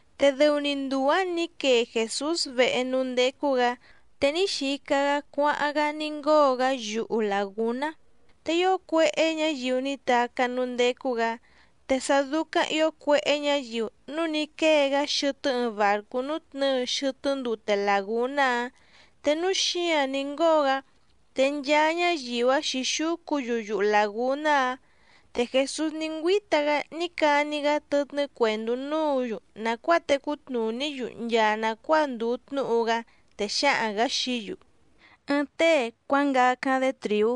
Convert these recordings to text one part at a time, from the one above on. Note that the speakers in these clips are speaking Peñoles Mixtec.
Te dɨu‑ni nduu‑ǎⁿ ní quee Jèsús vehe núú ndécú‑gǎ, te ní xica‑gá cuáháⁿ‑gá ní ngóo‑gá yuhu làgúná. Te ío cuéhé ñǎyiu ní tacá núú ndécú‑gǎ. Te sá dúcáⁿ ǐo cuéhé ñǎyiu núu ní quée‑gá xɨtɨ́ ɨɨⁿ bàrcú nútnɨ̌ɨ xɨtɨ́ ndute làgúná‑áⁿ, te núú xǐǎⁿ ní ngóo‑gá, te nchaa ñáyiu‑áⁿ xǐxúcu‑yu yuhu làgúná‑áⁿ. Te Jèsús ní ngüíta‑gá ní cani‑gá tɨtnɨ́ cuèndú núǔ‑yu nàcuáa tecú tnùní‑yu nchaa nàcuáa ndùu tnúhu‑gá, te xǎhaⁿ‑gǎ xií‑yu: —Ɨɨⁿ tée cuángacáⁿ‑dé trìú,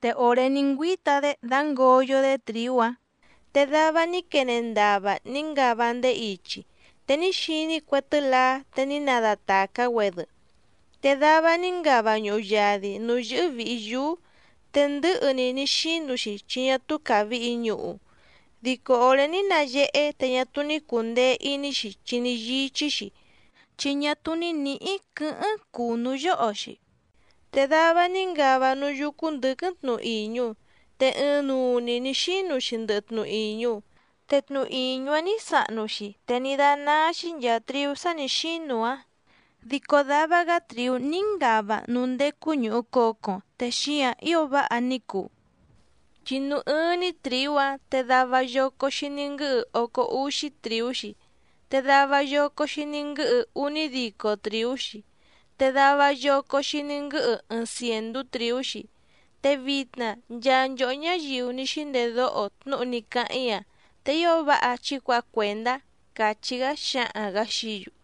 te òré ní ngüíta‑dé dǎngoyo‑dé trìú‑áⁿ, te dava ní quene ndava ní ngava ndéé ichi, te ní xiní cue tɨ́laá te ní nadatàcá‑güedɨ. Te dava ní ngava ñuhu yadi nǔú yɨ́hɨ́ vìhi yúú, te ndɨ̌hɨ‑ni ní xínu‑xi chi ñá túú càvihi ñuhu. Dico òré ní nayehé te ñá túú ní cùndee iní‑xi chi ní yíchí‑xi, chi ñá túú ní nǐhí quɨ̌hɨ́ⁿ cùnú yóho‑xi. Te dava ní ngava núú yúcú ndɨ̌quɨ́ⁿ tnu ìñu, te ɨɨⁿnuu‑ni nǐ xínu‑xi ndɨhɨ tnu ìñu. Te tnu ìñu‑áⁿ nǐ sahnu‑xi te ní dánáá‑xí nchàa triú sá nǐ xínu‑áⁿ. Dico dava‑gá trìú ní ngava núú ndécú ñùhu cocoⁿ te xíǎⁿ ío váha ní cuu, chi núú ɨ́ɨ́ⁿ‑ní trìú‑áⁿ te dava yoco‑xi ní nguɨ́hɨ ócó úxí trìú‑xi, te dava yoco‑xi ní nguɨ́hɨ únídico trìú‑xi, te dava yoco‑xi ní nguɨ́hɨ ɨɨⁿ cièndú trìú‑xi. Te vitna nchaa nchòhó ñáyiu ní xíndedóho tnúhu ní cáháⁿ‑í‑a, te ío váha chí cuǎha cuèndá —càchí‑gá xǎhaⁿ‑gǎ xií‑yu.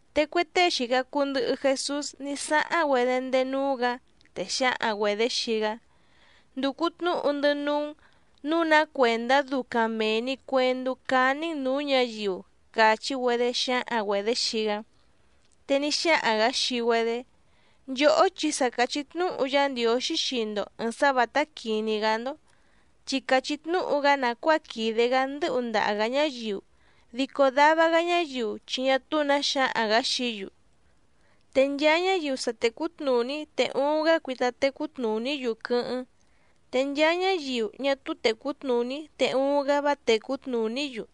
Te cue tée xìca cuu ndɨhɨ Jesús ní sáháⁿ‑güedé ndéé núú‑gǎ, te xǎhaⁿ‑güedě xii‑gá: —Ndùcu tnúhu‑ndɨ́ núú‑n nǔu ná cuèndá ducaⁿ mèe‑ni cuendú cání‑n nǔú ñǎyiu —càchí‑güedé xǎhaⁿ‑güedě xii‑gá. Te ní xáhaⁿ‑gǎ xii‑güedé: —Nchòhó chi sa càchí tnúhu Yá Ndiǒxí xii‑ndo ɨ̀ɨⁿ sá vǎtá quìní‑gá‑ndó, chi càchí tnúhu‑gá nàcuáa quìde‑gá ndɨ̌hu ndaha‑gǎ ñáyiu, dico dava‑gá ñáyiu chi ñá túú nǎ xǎhaⁿ‑gǎ xií‑yu. Te nchaa ñáyiu sa tècú tnùní te uuⁿ‑gá cuita tecú tnùní‑yu quɨ́hɨ́ⁿ, te nchaa ñáyiu ñá túú tècú tnùní te uuⁿ‑gá vá tècú tnùní‑yu.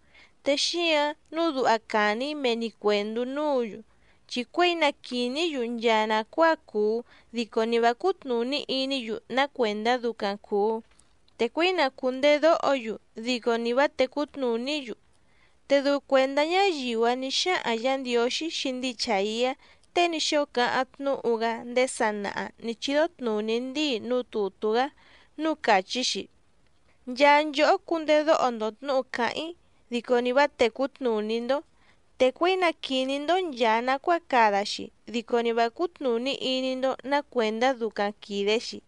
Te xíǎⁿ nǔu duha càni‑í mee‑ni cuèndú núǔ‑yu, chi cuěi na quìní‑yu nchaa nàcuáa cuu dico ni vǎ cútnùní iní‑yu ná cuèndá ducaⁿ cùu, te cuěi na cùndedóho‑yu dico ni vǎ tècú tnùní‑yu. Te dɨu cuèndá ñáyiu‑áⁿ nǐ xáhaⁿ Yǎ Ndiǒxí xii ndíi Chàiá tée ní xóo cáháⁿ tnúhu‑gá ndéé sanaha nǐ chídó tnùní ndíi núú tùtú‑gá núú càchí‑xi: Nchaa nchòhó cundedóho‑ndo tnǔhu càháⁿ‑í, dico ni vǎ tècú tnùní‑ndó, te cuěi na quìní‑ndó nchàa nacuáa cada‑xi, dico ni vǎ cútnùní iní‑ndó nǎ cuèndá ducaⁿ quìde‑xi.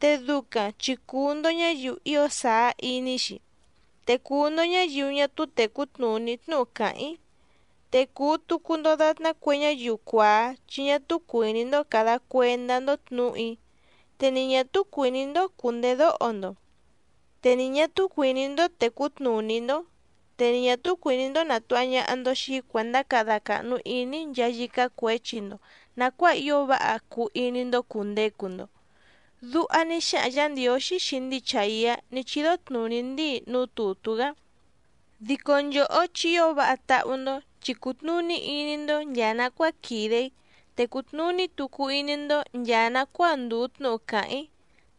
Te ducaⁿ chi cùu‑ndo ñáyiu ío sàá iní‑xi, te cùu‑ndo ñáyiu ñá túú tècú tnùní tnúhu càháⁿ‑í, te cùu tucu‑ndo datná cue ñáyiu cuàá chi ñá túú cuìní‑ndó càda cuendá‑ndó tnǔhu‑í, te ni ñà túú cuìní‑ndó cùndedóho‑ndo, te ni ñà túú cuìní‑ndó tècú tnùní‑ndó, te ni ñà túú cuìní‑ndó nàtuha ñaha‑ndo xii‑í cuèndá cada càhnu iní‑í nchaa yícá cuěchi‑ndo nàcuáa ío váha cuu iní‑ndó cùndecu‑ndo. Duha ní xáhaⁿ Yǎ Ndiǒxí xii ndíi Chàiá ní chídó tnùní ndíi núú tùtú‑gá. ’Dico nchòhó chi ío váha táhú‑ndó chi cùtnuní iní‑ndó nchàa nacuáa quìde‑í, te cùtnuní tucu iní‑ndó nchàa nacuáa ndùu tnúhu càháⁿ‑í.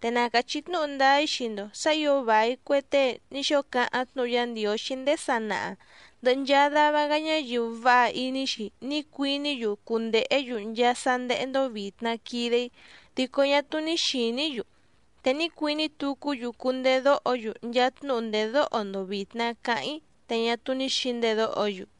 Te na càchí tnúhu ndáá‑í xii‑ndo sǎ ǐo vài cue tée ní xóo cáháⁿ tnúhu Yá Ndiǒxí ndéé sanaha ndɨ̀hɨ nchaa dava‑gá ñáyiu váha iní‑xi ní cuiní‑yu cundèhé‑yu nchaa sá ndéhé‑ndó vìtna quide‑í dico ñá túú ní xìní‑yu, te ní cuiní tucú‑yu cundedóho‑yu nchaa tnúhu ndèdóho‑ndo vìtna cáháⁿ‑í te ñá túú ní xǐndedóho‑yu.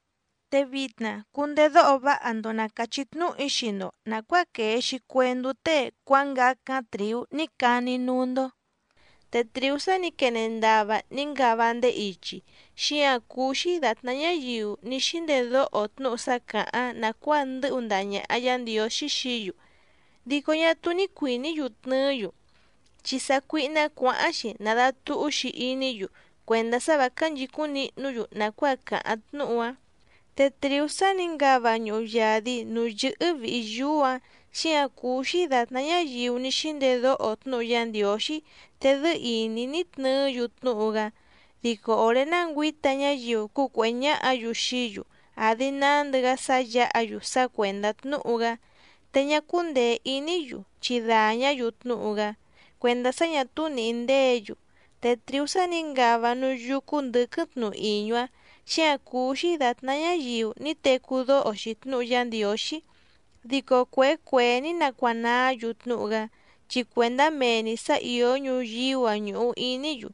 ’Te vitna cundedóho váha‑ndo na càchí tnúhu‑í xii‑ndo nàcuáa quèe‑xi cuendú tée cuángacáⁿ trìú ní cani‑í núú‑ndó. Te trìú sá nǐ quene ndava ní ngava ndéé ichi, xíǎⁿ cúú‑xí dàtná ñáyiu ní xíndedóho tnúhu sá càháⁿ nàcuáa ndɨ́hu ndaha ñàha Yá Ndiǒxí xií‑yu, dico ñá túú ní cuìní‑yu tnɨɨ́‑yu, chi sácuíhná cuǎháⁿ‑xi nàdatuhú‑xi iní‑yu cuèndá sá vǎ cánchìcúⁿ nihnú‑yu nàcuáa càháⁿ tnúhu‑áⁿ. Te trìú sá nǐ ngava ñuhu yadi nǔú yɨ́hɨ́ vìhi yúú‑ǎⁿ, xíǎⁿ cúú‑xí dàtná ñáyiu ní xíndedóho tnúhu Yá Ndiǒxí te dɨ́ɨ́ ìní ní tnɨɨ́‑yu tnúhu‑gá, dico òré ná ngüǐta ñáyiu cúcuèhé ñáhǎ‑yu xií‑yu àdi nándɨ‑gá sá yǎha‑yu sá cuèndá tnúhu‑gá, te ñá cúndèe iní‑yu chi dàñá‑yu tnúhu‑gá cuèndá sá ñà túú nìhí ndéě‑yu. Te trìú sá nǐ ngava núú yúcú ndɨ̌quɨ́ⁿ tnu ìñu‑áⁿ, xíǎⁿ cúú‑xí dàtná ñáyiu ní tecú dóho‑xi tnúhu Yá Ndiǒxí dico cuèé cuèé ní nacuanaá‑yu tnúhu‑gá, chi cuèndá mee‑ni sǎ ìó ñuyíú‑a ñùhu iní‑yu,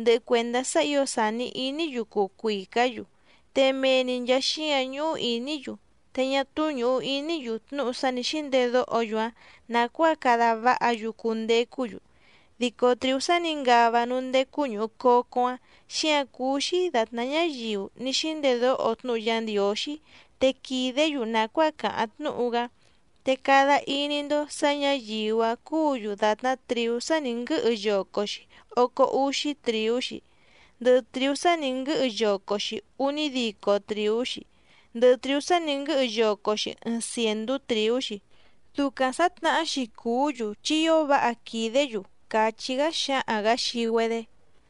ndɨhɨ cuèndá sá ǐo sàni iní‑yu cuu cuìcá‑yu, te mee‑ni nchàa xíǎⁿ ñúhú ìní‑yu te ñá túú ñùhu iní‑yu tnúhu sá nǐ xíndedóho‑yu‑áⁿ nàcuáa cada váha‑yu cundecú‑yu. Dico trìú sá nǐ ngava núú ndécú ñùhu cocoⁿ‑áⁿ, xíǎⁿ cúú‑xí dàtná ñáyiu ní xíndedóho tnúhu Yá Ndiǒxí te quìdé‑yu nàcuáa càháⁿ tnúhu‑gá. Te cada iní‑ndó sǎ ñǎyiu‑áⁿ cúǔ‑yu dàtná trìú sá nǐ nguɨ́hɨ yoco‑xi ócó úxí trìú‑xi, ndɨhɨ trìú sá nǐ nguɨ́hɨ yoco‑xi únídico trìú‑xi, ndɨhɨ trìú sá nǐ nguɨ́hɨ yoco‑xi ɨɨⁿ cièndú trìú‑xi. Ducaⁿ sǎtnahá‑xi cùú‑yu chi ío váha quìdé‑yu —càchí‑gá xǎhaⁿ‑gǎ xii‑güedé.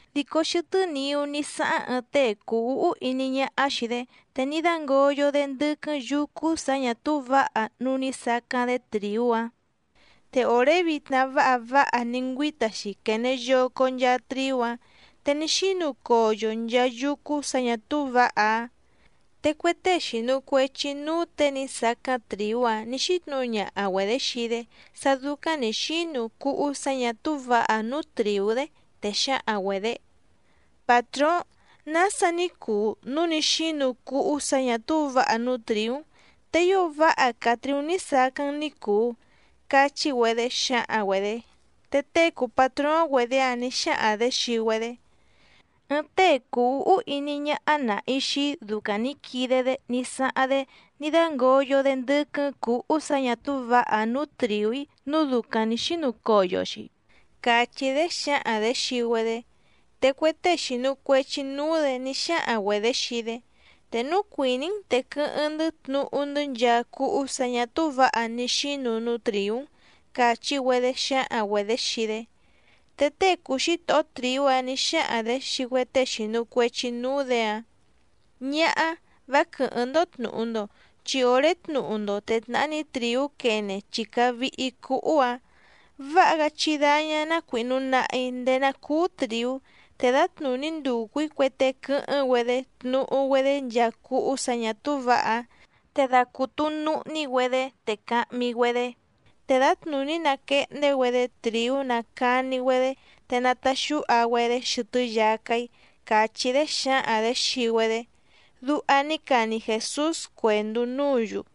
Dico xɨtɨ́ niú ní sáháⁿ ɨɨⁿ tée cùu úhú iní ñáhá xìi‑dé, te ní dǎngoyo‑dé ndɨ́quɨ́ⁿ yǔcú sǎ ñà túú vǎha núú nǐ sacáⁿ‑dé trìú‑áⁿ. Te òré vitna váha váha ní ngüíta‑xi quène yoco nchaa triú‑áⁿ, te ní xínu coyo nchaa yúcú sǎ ñà túú vǎha‑áⁿ. Te cue tée xìnu cuechi núú těe ní sacáⁿ trìú‑áⁿ nǐ xítnǔhu ñaha‑güedě xii‑dé sá dúcáⁿ nǐ xínu cúhú sǎ ñà túú vǎha‑áⁿ nǔú trìú‑dé, te xǎhaⁿ‑güedě: “Pàtróóⁿ, ¿nása ní cuu núu ní xínu cúhú sǎ ñà túú vǎha núú trìú‑n, te ío váha càa triú ní sacáⁿ‑n ní cùu?”, cachí‑güedé xǎhaⁿ‑güedě. Te tée cùu patróóⁿ‑güedě‑áⁿ nǐ xáhaⁿ‑dě xii‑güedé: “Ɨɨⁿ tée cùu úhú iní ñáhá nàhi xii‑í ducaⁿ nǐ quide‑dé ní sáháⁿ‑dé ní dǎngoyo‑dé ndɨ́quɨ́ⁿ cǔhú sǎ ñà túú vǎha‑áⁿ nǔú trìú‑í nǔu ducaⁿ nǐ xínu coyo‑xi”, càchí‑dé xǎhaⁿ‑dě xii‑güedé. Te cue tée xìnu cuechi núú‑dě ní xáhaⁿ‑güedě xii‑dé: “Te núu cuìní‑n te quɨ́hɨ́ⁿ‑ndɨ́ tnuhu‑ndɨ́ nchaa cúhú sǎ ñà túú vǎha ní xínu núú trìú‑n”, càchí‑güedé xǎhaⁿ‑güedě xii‑dé. Te tée cùu xítohó trìú‑áⁿ nǐ xáhaⁿ‑dě xii cue tée xìnu cuechi núú‑dě‑áⁿ: “Ñáhá, vá quɨ̀hɨ́ⁿ‑ndó tnùhu‑ndo, chi òré tnuhu‑ndo te tnàhá‑ni trìú quene chi càa vihi cúhú‑ǎⁿ. Váha‑gá chí dáñá ná cuìhnu nahi ndéé ná cùu triú, te dǎtnùní nducu‑ǐ cue tée quɨ́hɨ́ⁿ‑güedé tnuhu‑güedé nchaa cúhú sǎ ñà túú vǎha‑áⁿ, te dacùtu nuhní‑güedé te cahmi‑güedé, te dǎtnùní nàquehndé‑güedé trìú nacani‑güedé te nataxúha‑güedé xɨtɨ́ yacá‑í”, càchí‑dé xǎhaⁿ‑dě xii‑güedé —duha ní cani Jèsús cuèndú núǔ‑yu.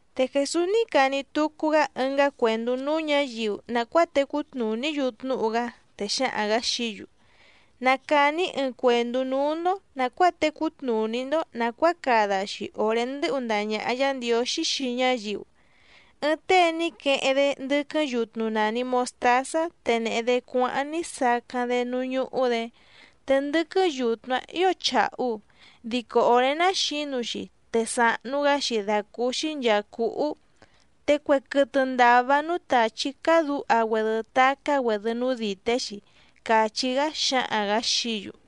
Te Jèsús ní cani tucu‑gá ɨngá cuèndú núú ñǎyiu nàcuáa tecú tnùní‑yu tnúhu‑gá, te xǎhaⁿ‑gǎ xií‑yu: —Na càni‑í ɨɨⁿ cuèndú núú‑ndó nàcuáa tecú tnùní‑ndó nàcuáa cada‑xi òré ndɨ́hu ndaha ñàha Yá Ndiǒxí xii ñáyiu. Ɨɨⁿ tée ní queheⁿ‑dé ndɨ́quɨ́ⁿ yutnu nàni mostázá te nèhe‑dé cuáháⁿ ní sacáⁿ‑dé núú ñúhú‑dě. Te ndɨ́quɨ́ⁿ yutnu‑áⁿ ǐo chàhu, dico òré ná xǐnu‑xi te sàhnu‑gá‑xi dàcúúxí nchàa cúhú, te cue quɨtɨ ndàva núú tàchí cádǔha‑güedɨ tacá‑güedɨ núú dìté‑xi —càchí‑gá xǎhaⁿ‑gǎ xií‑yu.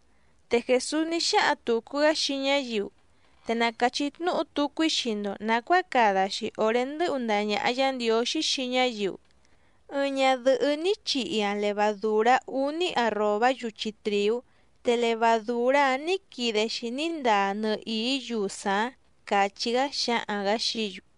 Te Jèsús ní xáhaⁿ tùcu‑gá xii ñáyiu: —Te na càchí tnúhu tucu‑í xii‑ndo nàcuáa cada‑xi òré ndɨ́hu ndaha ñàha Yá Ndiǒxí xii ñáyiu. Ɨɨⁿ ñadɨ̀hɨ́ ní chihi‑aⁿ levadùrá úní arròbá yuchi trìú, te levadùrá‑áⁿ nǐ quide‑xi ní ndaa nɨhìí yusaⁿ‑áⁿ —càchí‑gá xǎhaⁿ‑gǎ xií‑yu.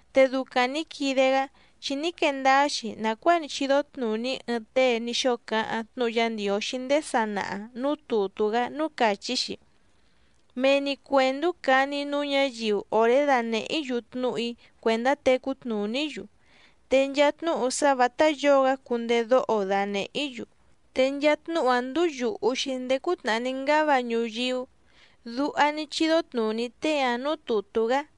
Te ducaⁿ nǐ quide‑gá chi ní quee ndáá‑xi nàcuáa ní chídó tnùní ɨɨⁿ tée ní xóo cáháⁿ tnúhu Yá Ndiǒxí ndéé sanaha nǔú tùtú‑gá núú càchí‑xi: Mee‑ni cuèndú cani‑í núú ñǎyiu òré danèhé‑í‑yu tnúhu‑í cuèndá tecú tnùní‑yu, te nchaa tnúhu sá vǎtá yǒo‑gá cundedóho danèhé‑í‑yu, te nchaa tnúhu‑áⁿ ndúú yùhu‑xi ndéé cútnàhá ní ngáva ñuyíú. Duha ní chídó tnùní tée‑áⁿ nǔú tùtú‑gá.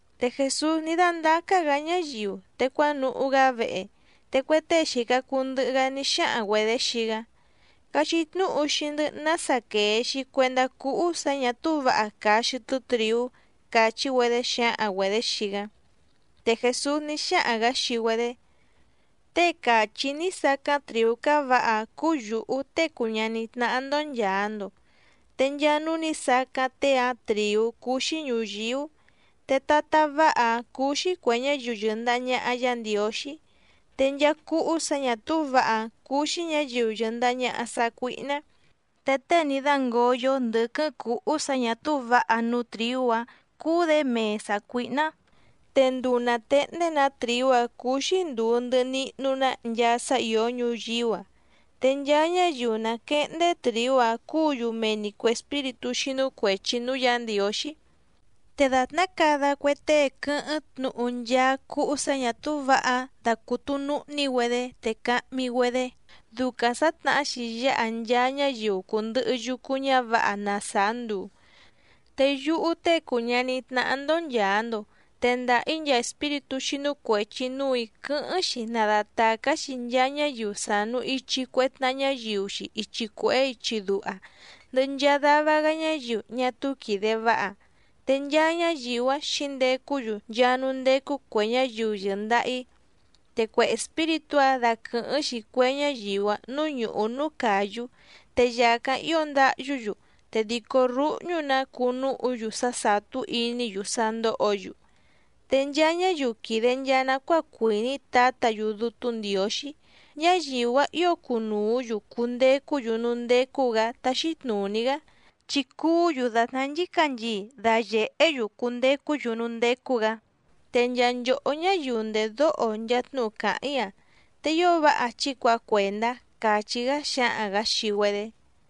Te Jèsús ní dándácá‑gǎ ñáyiu te cuánuhú‑gá vehe, te cue tée xìca cuu ndɨhɨ‑gá ní xáhaⁿ‑güedě xii‑gá: —Cachí tnúhu xii‑ndɨ́ nása quèe‑xi cuendá cúhú sǎ ñà túú vǎha càa xɨtɨ́ trìú —càchí‑güedé xǎhaⁿ‑güedě xii‑gá. Te Jèsús ní xáhaⁿ‑gǎ xii‑güedé: —Tée càchí‑í ní sacáⁿ trìú cávǎha‑áⁿ cúú yǔhú Tée cùu ñaní tnáhá‑ndó nchàa‑ndo. Te nchaa núú nǐ sacáⁿ tée‑áⁿ trìú cúú‑xí ñùyíú. Te tatá váha‑áⁿ cúú‑xí cuè ñáyiu yɨ̀ndaha ñaha Yá Ndiǒxí. Te nchaa cúhú sǎ ñà túú vǎha‑áⁿ cúú‑xí ñǎyiu yɨ̀ndaha ñaha sácuíhná. Te tée ní dǎngoyo ndɨ́quɨ́ⁿ cǔhú sǎ ñà túú vǎha núú trìú‑áⁿ cúú‑dě mee sàcuíhná. Te nduu nàtehndé‑nǎ trìú‑áⁿ cúú‑xí ndùu ndɨhɨ nihnu‑ná nchaa sá ìó ñuyíú‑a. Te nchaa ñáyiu nàquehndé trìú‑áⁿ cúǔ‑yu mee‑ni cuè espíritú xínú cuèchi núú Yǎ Ndiǒxí. Te dàtná cada cue tée quɨ́hɨ́ⁿ tnuhu nchaa cúhú sǎ ñà túú vǎha‑áⁿ dacùtu nuhní‑güedé te cahmi‑güedé, ducaⁿ sǎtnahá‑xi yáha nchaa ñáyiu cùndɨhɨ yucu ñávǎha na sàá nduu. Te yúhú Tée cùu ñaní tnáhá‑ndó nchàa‑ndo tendaha‑í nchaa espíritú xínú cuèchi núù‑í quɨ́hɨ́ⁿ‑xi nadatàcá‑xi nchaa ñáyiu sànu ichi cue tnaha ñáyiu‑xi ichi cuèhé ichi duha, ndɨhɨ nchaa dava‑gá ñáyiu ñá túú quìde váha, te nchaa ñáyiu‑áⁿ xǐndecú‑yu nchaa núú ndécú cuè ñáyiu yɨ̀ndaha‑í. Te cue espíritú‑áⁿ daquɨ̀hɨ́ⁿ‑xi cue ñáyiu‑áⁿ nǔú ñùhú núú càyú, te yàcáⁿ ío ndáhyú‑yu te dìcó rúhñú‑nǎ cuu núhu‑yu sá sàtú iní‑yu sá ndóhǒ‑yu. Te nchaa ñáyiu quìde nchaa nacuáa cuìní Tǎtǎ‑yu Dútú Ndiǒxí, ñáyiu‑áⁿ ǐo cunùú‑yu cundecú‑yu núú ndécú‑gǎ táxí tnùní‑gá, chi cuú‑yu dàtná nchícanchii dayèhé‑yu cundecú‑yu núú ndécú‑gǎ. Te nchaa nchòhó ñáyiu ndèdóho nchaa tnúhu càháⁿ‑í‑a, te ío váha chí cuǎha cuèndá —càchí‑gá xǎhaⁿ‑gǎ xii‑güedé.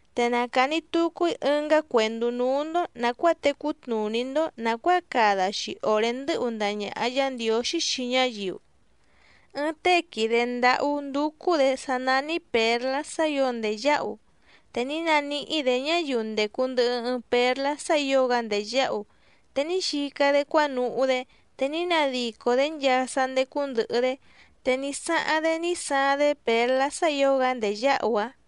’Te na càni tucu‑í ɨngá cuèndú núú‑ndó nàcuáa tecú tnùní‑ndó nàcuáa cada‑xi òré ndɨ́hu ndaha ñàha Yá Ndiǒxí xii ñáyiu. Ɨɨⁿ tée quìde ndáhú ndúcú‑dě sá nání pěrlá sá ǐo ndèyáhu. Te ní naníhí‑dě ñáyiu ndècu ndɨhɨ ɨɨⁿ pérlá sá ǐo‑gá ndèyáhu, te ní xica‑dé cuánuhú‑dé te ní nadico‑dě nchaa sá ndécú ndɨ̀hɨ‑dé, te ní sáháⁿ‑dé ní saaⁿ‑dé pěrlá sá ǐo‑gá ndèyáhu‑áⁿ.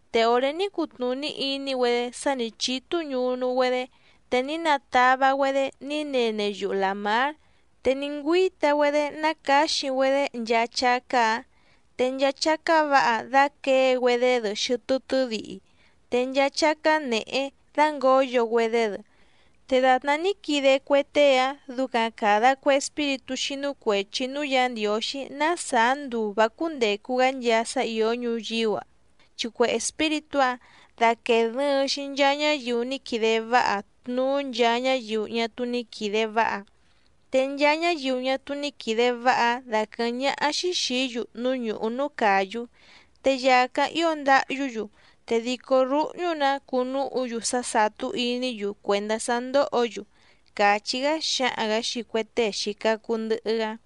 Te òré ní cutnùní iní‑güedé sá nǐ chítú ñunu‑güedé, te ní natava‑güedé ní nene yuhu làmár, te ní ngüíta‑güedé nácǎxi‑güedé nchaa chácá‑ǎⁿ. Te nchaa chácá vǎha dàquée‑güedé‑dɨ xɨtɨ́ tɨ́dihi, te nchaa chácá nèhé dǎngoyo‑güedé‑dɨ. Te dàtná ní quide cue tée‑áⁿ ducaⁿ càda cue espíritú xínú cuèchi núú Yǎ Ndiǒxí ná sàá nduu vǎ cúndècu‑gá nchaa sá ìó ñuyíú‑a, chi cue espíritú‑áⁿ daquèe dɨɨⁿ‑xi nchaa ñáyiu ní quide váha tnuú nchaa ñáyiu ñá túú ní quìde váha. Te nchaa ñáyiu ñá túú ní quìde váha‑áⁿ daquɨ̀hɨ́ⁿ ñáhá‑xí xìí‑yu núú ñùhú núú càyú, te yàcáⁿ ío ndáhyú‑yu, te dìcó rúhñú‑nǎ cuu núhu‑yu sá sàtú iní‑yu cuèndá sá ndóhǒ‑yu —càchí‑gá xǎhaⁿ‑gǎ xii cue tée xìca cuu ndɨhɨ‑gá.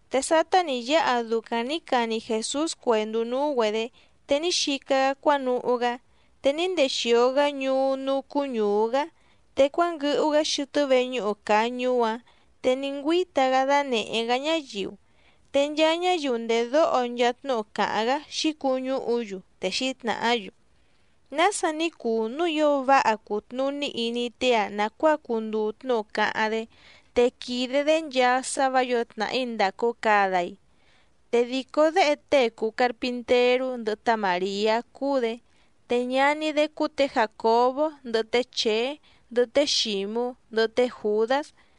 Te sátá nǐ yáha ducaⁿ nǐ cani Jèsús cuèndú núú‑güedě, te ní xica‑gá cuánuhú‑gá. Te ní ndexìo‑gá ñuú núú cúú ñùú‑gá, te cuánguɨhu‑gá xɨtɨ́ veñúhu càa ñuú‑áⁿ te ní ngüíta‑gá dánèhé‑gá ñáyiu. Te nchaa ñáyiu ndèdóho nchaa tnúhu càháⁿ‑gá xǐcuñúhu‑yu, te xǐtnàhá‑yu: —¿Nása ní cuu núu ío váha cùtnuní iní tée‑a nàcuáa cunduu tnúhu cáháⁿ‑dé, te quìde‑dé nchaa sá vǎ yǒo tnàhí ndàcu cada‑i? Te dìcó déhe tée cùu carpinterú ndɨhɨ tá Màriá cúú‑dě, te ñaní‑dé cúú tě Jàcobó, ndɨhɨ té Chèé, ndɨhɨ té Xǐmú, ndɨhɨ té Jùdás.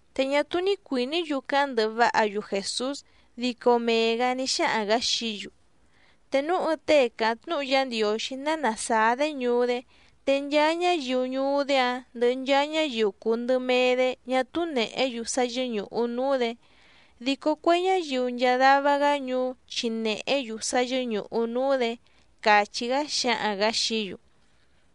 Te ñá túú ní cuìní‑yu cáháⁿ ndɨhɨ váha‑yu Jèsús, dico mee‑gǎ ní xáhaⁿ‑gǎ xií‑yu: —Te núu ɨɨⁿ tée càháⁿ tnúhu Yá Ndiǒxí ná nàsáá‑dé ñuú‑dé, te nchaa ñáyiu ñuú‑dé‑áⁿ ndɨhɨ nchaa ñáyiu cùu ndɨmee‑dé ñá túú nèhé‑yu sá yɨ́ñùhu núú‑dě, dico cue ñáyiu nchaa dava‑gá ñuú chi nèhé‑yu sá yɨ́ñùhu núú‑dě —càchí‑gá xǎhaⁿ‑gǎ xií‑yu.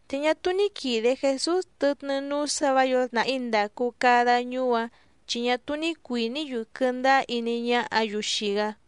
Te ñá túú ní quìde Jesús tɨtnɨ́ núú sǎ vǎ yǒo tnàhí ndàcu cada ñuú‑áⁿ, chi ñá túú ní cuìní‑yu quɨndáá iní ñáhǎ‑yu xii‑gá.